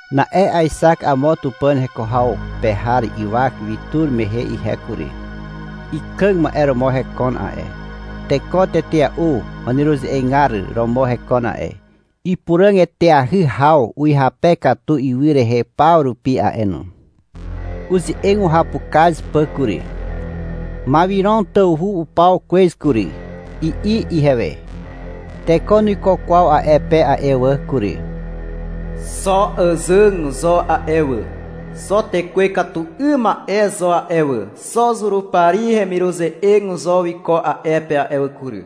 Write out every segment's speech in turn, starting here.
Na'e aexak amo Tupàn heko haw pe har ywak wi tur mehe ihe kury. Ikàg ma'e romo hekon a'e, teko tetea'u waneruze'egar romo hekon a'e. Ipuràg eteahy haw uhyape katu ywy rehe paw rupi a'e no. Uze'eg uhapukaz pà kury. — Mawiron tawhu upaw kwez kury, i'i ihewe. — Teko nuiko kwaw a'e pe a'e wà kury. Xo àzàg zo a'e wà, xo tekwe ikatu 'ym ma'e zo a'e wà, xo Zurupari hemiruze'eg zo wiko a'e pe a'e wà kury.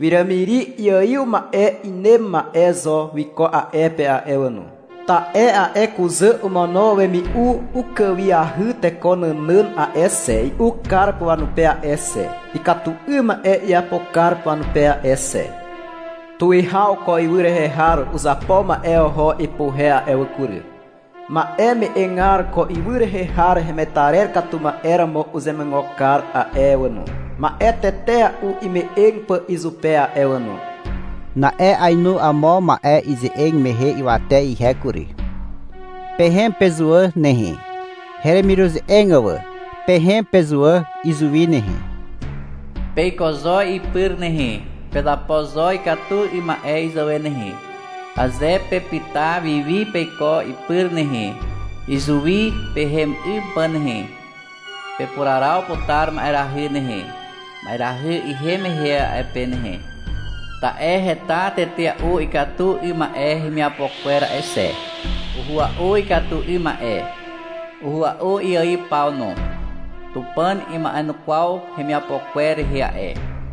Wiràmiri iaiw ma'e inem ma'e zo wiko a'e pe a'e wà no, i'i ihewe. — Ta'e a'e kuzà omono wemi'u ukàwiahy teko nànàn a'e xe, i'u kar pà wanupe a'e xe, ikatu 'ym ma'e iapo kar pà wanupe a'e xe, i'i ihewe. — Tuwihaw ko ywy rehe har uzapo ma'e oho ipuhe a'e wà kury. Ma'e me'egar ko ywy rehe har hemetarer katu ma'e romo uzemuigo kar a'e wà no, ma'e tetea'u ime'eg pà izupe a'e wà no, i'i ihewe. Na'e ainu amo ma'e ize'eg mehe ywate ihe kury. — Pehem pezuwà nehe, heremiruze'eg wà. Pehem pezuwà izuwi nehe. Peiko zo ipyr nehe, pezapo zo ikatu 'ym ma'e izàwe nehe. Aze pepyta wi wi peiko ipyr nehe, izuwi pehem 'ym pà nehe, pepuraraw putar ma'erahy nehe, ma'erahy ihem mehe a'e pe nehe. Ta'e heta tetea'u ikatu 'ym ma'e hemiapo kwer a'e xe. Uhua'u ikatu 'ym ma'e. Uhua'u iaiw paw no. Tupàn ima'enukwaw hemiapo kwer rehe a'e.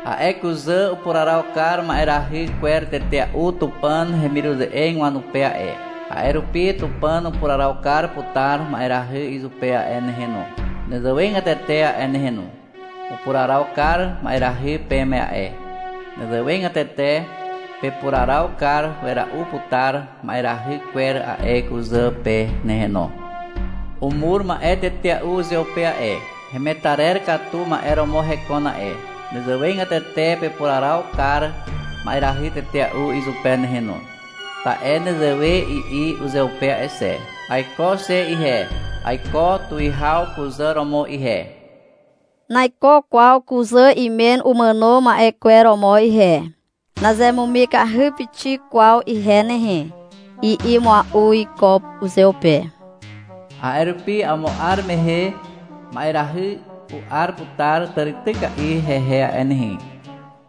A'e kuzà upuraraw kar ma'erahy kwer tetea'u Tupàn hemiruze'eg wanupe a'e. A'e rupi Tupàn upuraraw kar putar ma'erahy izupe a'e nehe no, nezewegatete a'e nehe no. Upuraraw kar ma'erahy peme a'e. Nezewegatete pepuraraw kar wera'u putar ma'erahy kwer a'e kuzà pe nehe no. Umur ma'e tetea'u uzeupe a'e, hemetarer katu ma'e romo hekon a'e. Nezewegatete pepuraraw kar ma'erahy tetea'u izupe nehe no. Ta'e nezewe i'i uzeupe a'e xe, — Aiko xe ihe, aiko tuwihaw kuzà romo ihe. Naiko kwaw kuzà imen umàno ma'e kwer romo ihe. Nazemumikahy pixik kwaw ihe nehe, i'i mua'u iko uzeupe. A'e rupi amo 'ar mehe ma'erahy u'ar putar tàrityka'i hehe a'e nehe.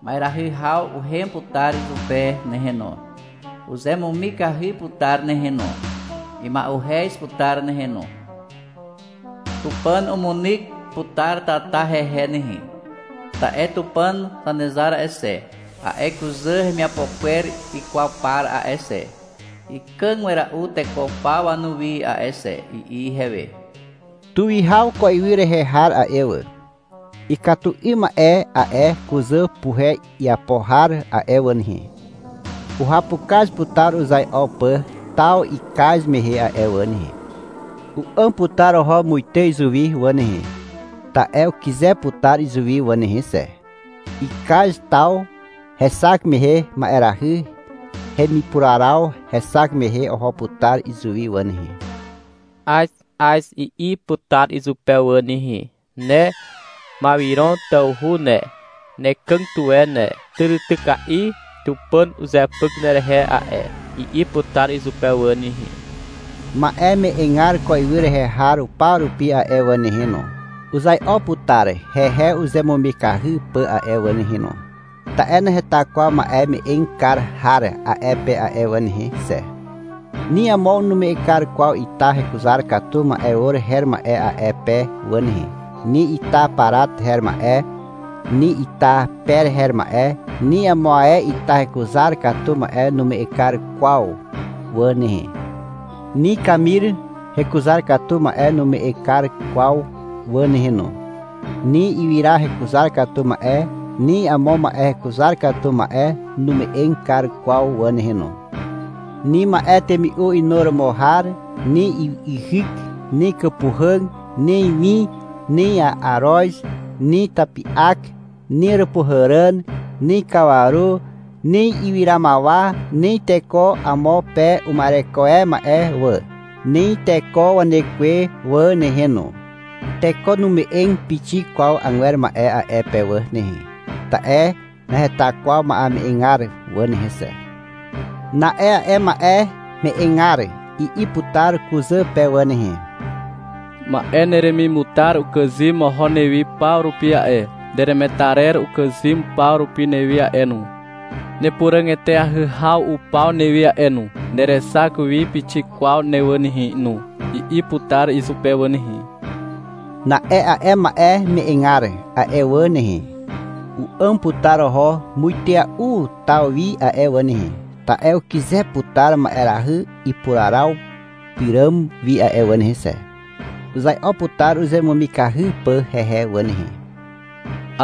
Ma'eahy haw uhem putar izupe nehe no. Uzemumikahy putar nehe no. Ima'uhez putar nehe no. Tupàn umunyk putar tata hehe nehe, ta'e Tupàn Zanezar a'e xe, a'e kuzà hemiapo kwer ikwaw par a'e xe, ikàg wera'u teko paw wanuwi a'e xe, i'i ihewe. Tuwihaw ko ywy rehe har a'e wà, ikatu 'ym ma'e a'e kuzà puhe iapo har a'e wà nehe, uhapukaz putar uzai'o pà taw ikaz mehe a'e wà nehe. U'àm putar oho muite izuwi wà nehe, ta'e ukyze putar izuwi wà nehe xe. Ikaz taw hexak mehe ma'erahy hemipuraraw hexak mehe oho putar izuwi wà nehe. — Az, Az, i'i putar izupe wà nehe. — Ne Mawiron tawhu ne, nekàg tuwe ne. Tàrityka'i Tupàn uzepyk nerehe a'e, i'i putar izupe wà nehe. Ma'e me'egar ko ywy rehe har paw rupi a'e wà nehe no, uzai'o putar hehe uzemumikahy pà a'e wà nehe no, ta'e naheta kwaw ma'e me'eg kar har a'e pe a'e wà nehe xe. Ni amo nume'eg kar kwaw ita hekuzar katu ma'e or her ma'e a'e pe wà nehe. Ni ita parat her ma'e, ni ita per her ma'e, ni amo ae ita hekuzar katu ma'e nume'eg kar kwaw wà nehe. Ni kamir hekuzar katu ma'e nume'eg kar kwaw wà nehe no. Ni ywyra hekuzar katu ma'e ni amo ma'e hekuzar katu ma'e nume'eg kar kwaw wà nehe no. Ni ma'e temi'u inuromo har, ni yhyk, ni kàpuhàg, ni win, ni aroz, ni tapi'ak, ni Àràpuhàràn, ni kawaru, ni ywyramawa, ni teko amo pe uma'ereko e ma'e wà, ni teko wanekwe wà nehe no. Teko nume'eg pixik kwaw agwer ma'e a'e pe wà nehe, ta'e naheta kwaw wame'egar wà nehe xe. Na'e a'e ma'e me'egar i'i putar kuzà pe wà nehe. — Ma'e neremimutar ukàzym oho newi paw rupi a'e, neremetarer ukàzym paw rupi newi a'e no, nepuràg eteahy haw upaw newi a'e no, nerexak wi pixik kwaw ne wà nehe no, i'i putar izupe wà nehe. Na'e a'e ma'e me'egar a'e wà nehe, u'àm putar oho muitea'u taw wi a'e wà nehe, ta'e ukyze putar ma'erahy ipuraraw pyràm wi a'e wà nehe xe. Uzai'o putar uzemumikahy pà hehe wà nehe.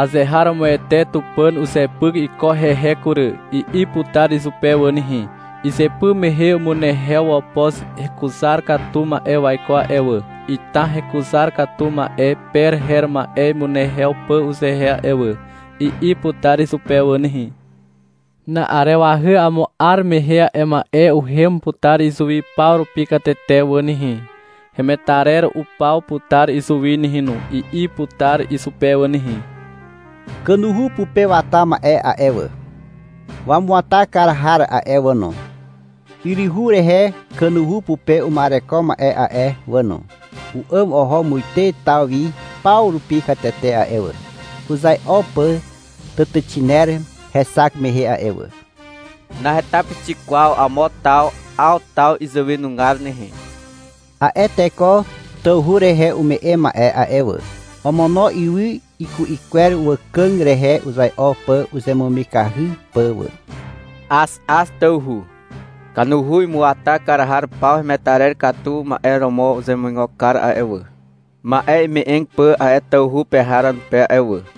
— Azeharomoete Tupàn uzepyk iko hehe kury, i'i putar izupe wà nehe. — Izypy mehe umunehew wopoz hekuzar katu ma'e waiko a'e wà, ita hekuzar katu ma'e per her ma'e imunehew pà uzehe a'e wà, i'i putar izupe wà nehe. — Na'arewahy amo 'ar mehe a'e ma'e uhem putar izuwi paw rupi katete wà nehe, hemetarer upaw putar izuwi nehe no, i'i putar izupe wà nehe. Kanuhu pupe wata ma'e a'e wà, wamuata kar har a'e wà no, yryhu rehe kanuhu pupe uma'ereko ma'e a'e wà no, u'àm oho muite taw wi paw rupi katete a'e wà, uzai'o pà tàtàxiner hexak mehe a'e wà. — Naheta pixik kwaw amo taw 'aw taw izàwenugar nehe, i'i izupe wà. A'e teko tawhu rehe ume'e ma'e a'e wà, omono ywy iku'i kwer wàkàg rehe uzai'o pà uzemumikahy pà wà. — Az, Az, tawhu, i'i izupe wà. — Kanuhu imuata kar har paw hemetarer katu ma'e romo uzemuigo kar a'e wà, ma'e ime'eg pà a'e tawhu pe har wanupe a'e wà, i'i izupe wà.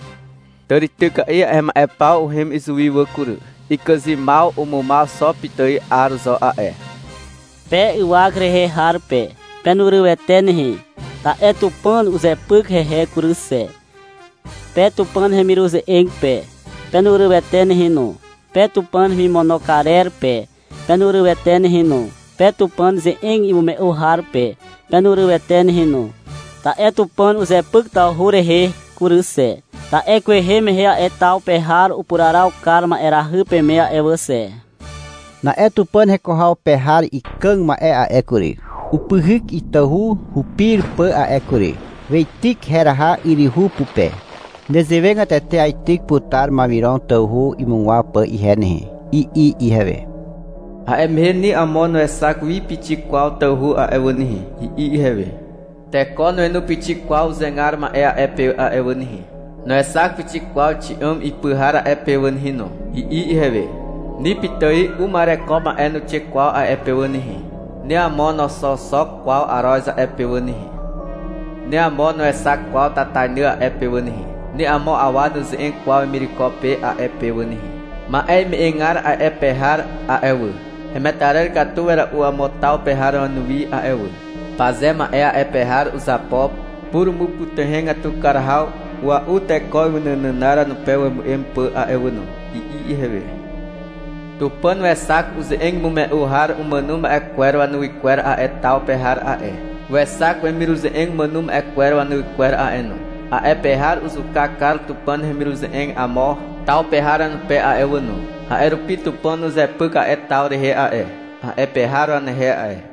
Tàrityka'i a'e ma'e paw uhem izuwi wà kury. Ikàzymaw umumaw xo pitài 'ar zo a'e, i'i izupe wà. Pe ywak rehe har pe, penurywete nehe, ta'e Tupàn uzepyk hehe kury xe. Pe Tupàn hemiruze'eg pe, penurywete nehe no. Pe Tupàn hemimono karer pe, penurywete nehe no. Pe Tupàn ze'eg imume'u har pe, penurywete nehe no. Ta'e Tupàn uzepyk tawhu rehe kury xe, ta'e kwehe mehe a'e taw pe har upuraraw kar ma'erahy peme a'e wà xe. Na'e Tupàn heko haw pe har ikàg ma'e a'e kury, upyhyk itahu hupir pà a'e kury. Weityk heraha yryhu pupe. — Nezewegatete aityk putar Mawiron tawhu imugwaw pà ihe nehe, i'i ihewe. — A'e mehe ni amo nuexak wi pixik kwaw tawhu a'e wà nehe, i'i ihewe. — Teko nuenu pixik kwaw uzegar ma'e a'e pe a'e wà nehe. Nuexak pixik kwaw xi'àm ipy har a'e pe wà nehe no, i'i ihewe. — Ni pitài uma'ereko ma'e nuixe kwaw a'e pe wà nehe. Ni amo noxooxok kwaw aroz a'e pe wà nehe. Ni amo nuexak kwaw tatainy a'e pe wà nehe. Ni amo awa nuze'eg kwaw wemireko pe a'e pe wà nehe. Ma'e me'egar a'e pe har a'e wà, hemetarer katu wera'u amo taw pe har wanuwi a'e wà. Paze ma'e a'e pe har uzapo purumupytuhegatu kar haw ua'u teko ywy nànànar wanupe wemu'em pà a'e wà no, i'i ihewe. Tupàn wexak uze'eg imume'u har umàno ma'e kwer wanuwy kwer a'e taw pe har a'e, wexak wemiruze'eg umàno ma'e kwer wanuwy kwer a'e no. A'e pe har uzuka kar Tupàn hemiruze'eg amo taw pe har wanupe a'e wà no. A'e rupi Tupàn uzepyk a'e taw rehe a'e, a'e pe har wanehe a'e.